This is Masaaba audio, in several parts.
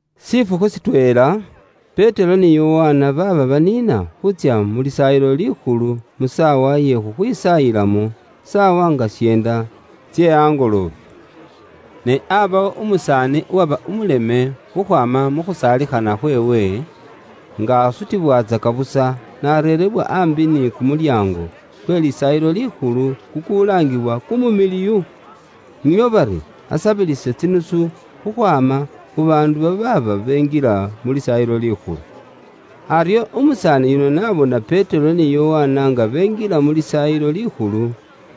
Shifukhu shitweela, Petero ni Yokana baaba baniina khuutsya mu Lisaayilo Likhulu mu saawa ye khuloombelamo, saawa nga syeenda tse kumuusi. Ne aabawo umusaani uwaba umuleme khukhwaama khu khusaalikhana khweewe, nga asutibwatsaka busa n'areebwa aambi ni kumulyaango kwe Lisaayilo Likhulu kukulaangiwa KUMUMILIWU, nio bari asabilise tsinusu khukhwaama khu baandu babaaba benjila mu Lisaayilo Likhulu. Aryo umusaani yuno n'abona Petero ni Yokana nga benjila mu Lisaayilo Likhulu,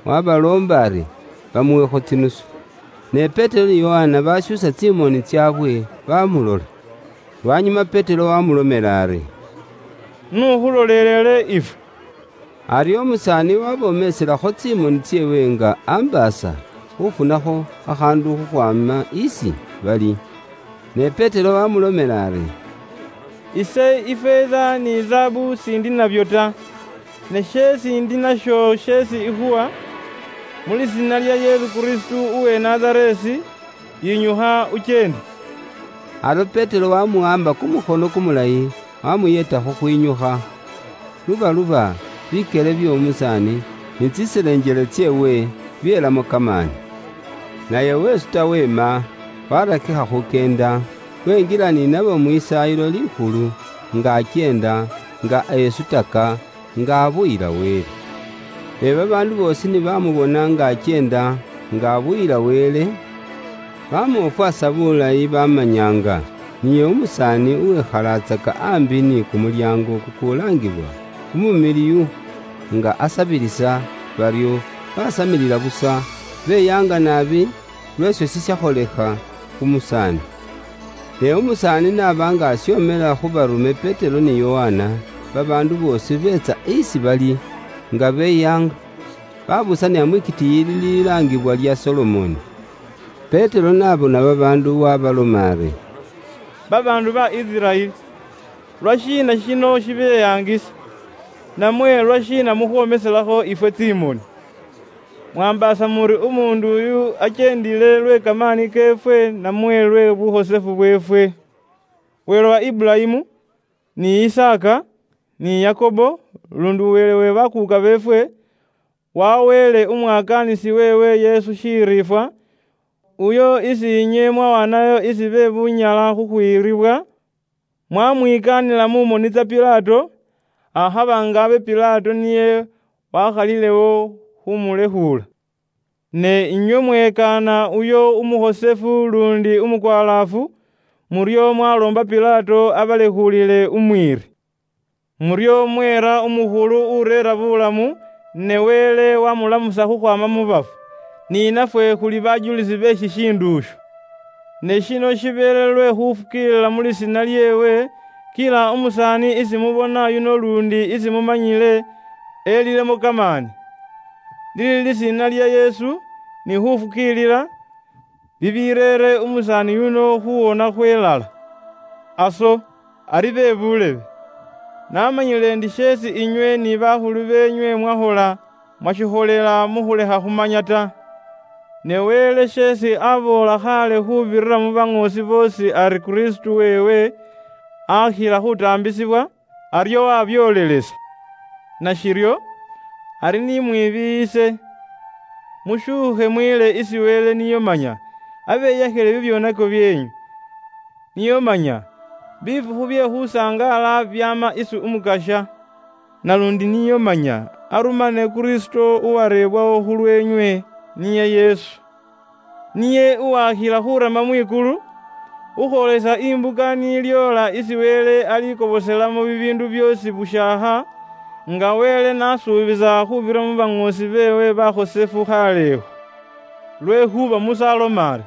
wabaloomba ari bamuwekho tsinusu. Ne Petero ni Yokana bashuusa tsimoni tsaabwe baamulola. Lwanyuma Petero waamulomela ari, “Iwe n'ukhuloleelele ifwe.” Aryo umusaani waabomiisilakho tsimoni tseewe nga ambaasa khuufunakho khakhaandu khukhwaama isi bali. Ne Petero waamulomela ari, “Ifeeza ni zaabu ise s'indi nabyo ta, ne sheesi ndi nasho sheesi ikhuwa: Mu lisiina lya Yesu Kristo uwe Nazareesi, yinyukha ukyeende.” Aryo Petero wamuwaamba kumukhono kumulayi, wamuyeeta khukhwinyukha. Lubaluba, bikyele by'omusaani ni tsiselenjele tseewe byelamo kamaani. Naye wesuta weema, warakikha khukyenda, wenjila ni nabo mu Lisaayilo Likhulu, nga akyeenda, nga esutaka, nga abuyila Wele. Ne babaandu boosi ni bamubona nga akyeenda, nga abuyila Wele, bamwofwasa bulayi bamanya nga niye umusaani uwekhalatsaka aambi ni kumulyaango kukulaangiwa KUMUMILIWU, nga asabilisa, baryo basamilila busa, beyaanga naabi, lw'esho shishakholekha khu musaani. Ne umusaani n'aba nga ashomela khu baarume Petero ni Yokana, babaandu boosi beetsa isi bali, nga beyaanga, babuusanila mwitikiiyi lililaangibwa lya Solomoni. Petero n'abona babaandu waabaloma ari, “Babaandu ba Isiraeli, lwashiina shino shibeyaangisa? Namwe lwashiina mukhwoomisilakho ifwe tsimoni? Mwaambaasa muri umuundu uyu akyeendile lwe kamaani keefwe, namwe lwe bukhosefu bweefwe? Wele wa Iburayimu, ni Isaaka, ni Yakobo, luundi Wele we bakuuka beefwe, waweele Umwakaanisi weewe Yesu shiriifwa, uyo isi inywe mwawaanayo isi be bunyala khukhwiiribwa, mwamwikaanila mu moni tsa Pilato, akhaba nga abe Pilato niye wakhalilewo khumulekhuula. Ne inywe mwekaana uyo umukhosefu luundi umukwalaafu, muryo mwaloomba Pilato abalekhuulile umwiiri. Muryo mweera umukhulu ureera buulamu, ne Wele wamulamusa khukhwaama mu bafu. Ni nafwe khuli bajulisi be shishiindu isho. Ne shino shibeele lwe khufukiilila mu lisiina lyeewe, kila umusaani isi mubona yuno luundi isi mumanyile, elilemo kamaani. Lili lisiina lya Yesu, ni khufukiilila, bibireere umusaani yuno khuwona khwelala. “Aso, ari be buulebe, namanyile ndi sheesi inywe ni bawuli beenywe mwakhola, mwashikholela mu khulekha khumanya ta. Ne Wele sheesi aboola khaale khuubirira mu baŋoosi boosi ari Kristo weewe akhila khutaambisibwa, aryo wabyoolelesa. Nashiryo, ari ni mwibiiyise mushuukhe mwiile isi Wele nio manya abeyakhile bibyoonako byeenywe, nio manya bifukhu bye khusangaala byaama isi Umukasya. Naluundi nio manya arumane Kristo uwareebwawo khulweenywe, niye Yesu. Niye uwakhila khurama mwikulu khukhwoolesa imbuka ni lyoola isi Wele alikoboselamo bibiindu byoosi bushaakha, nga Wele n'asuubisa khuubirira mu baŋoosi beewe bakhosefu khaalekho. Lwekhuuba Musa aloma ari,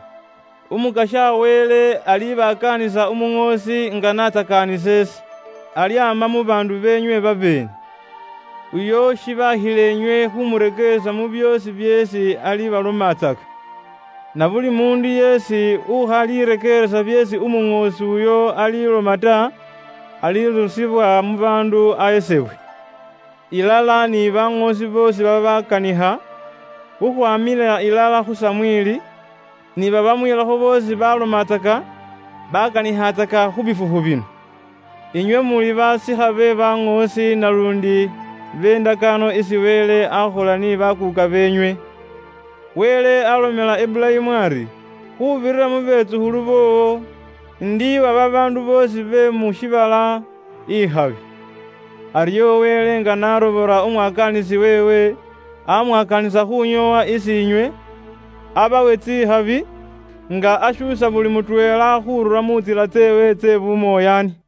‘Umukasya Wele alibasindikhila inywe Umuŋoosi nga n'aasindikha ise, naluundi alyaama mu bandaayeenwe babeene. Muli ni khulondelelaatsaka ibyo byoosi byeesi niye alibaboolatsakila inywe. Na buli umuundu yeesi ukhalirekeeresa byeesi Umuŋoosi uyo aliloma ta, alirusibwa mu baandu ahesebwe.’ “Ilala ni baŋoosi boosi babaakanikha khukhwamila ilala khu Samweli, ni babamwiilakho boosi balomatsaka, baakanikhatsaka khu bifukhu bino. Inywe muli basikha be baŋoosi naluundi be ndakaano isi Wele akhola ni bakuuka beenywe. Wele alomela Iburayimu ari, ‘Khuubirira mu betsukhulu boowo, indiiwa babaandu boosi be mu shiibala ikhabi.’ Aryo Wele nga n'aarobola Umwakaanisi weewe, amwakaanisa khunyoowa isi inywe, abawe tsikhabi, nga ashuusa buli mutweela khurura mu ntsila tseewe tse bumoyaani.”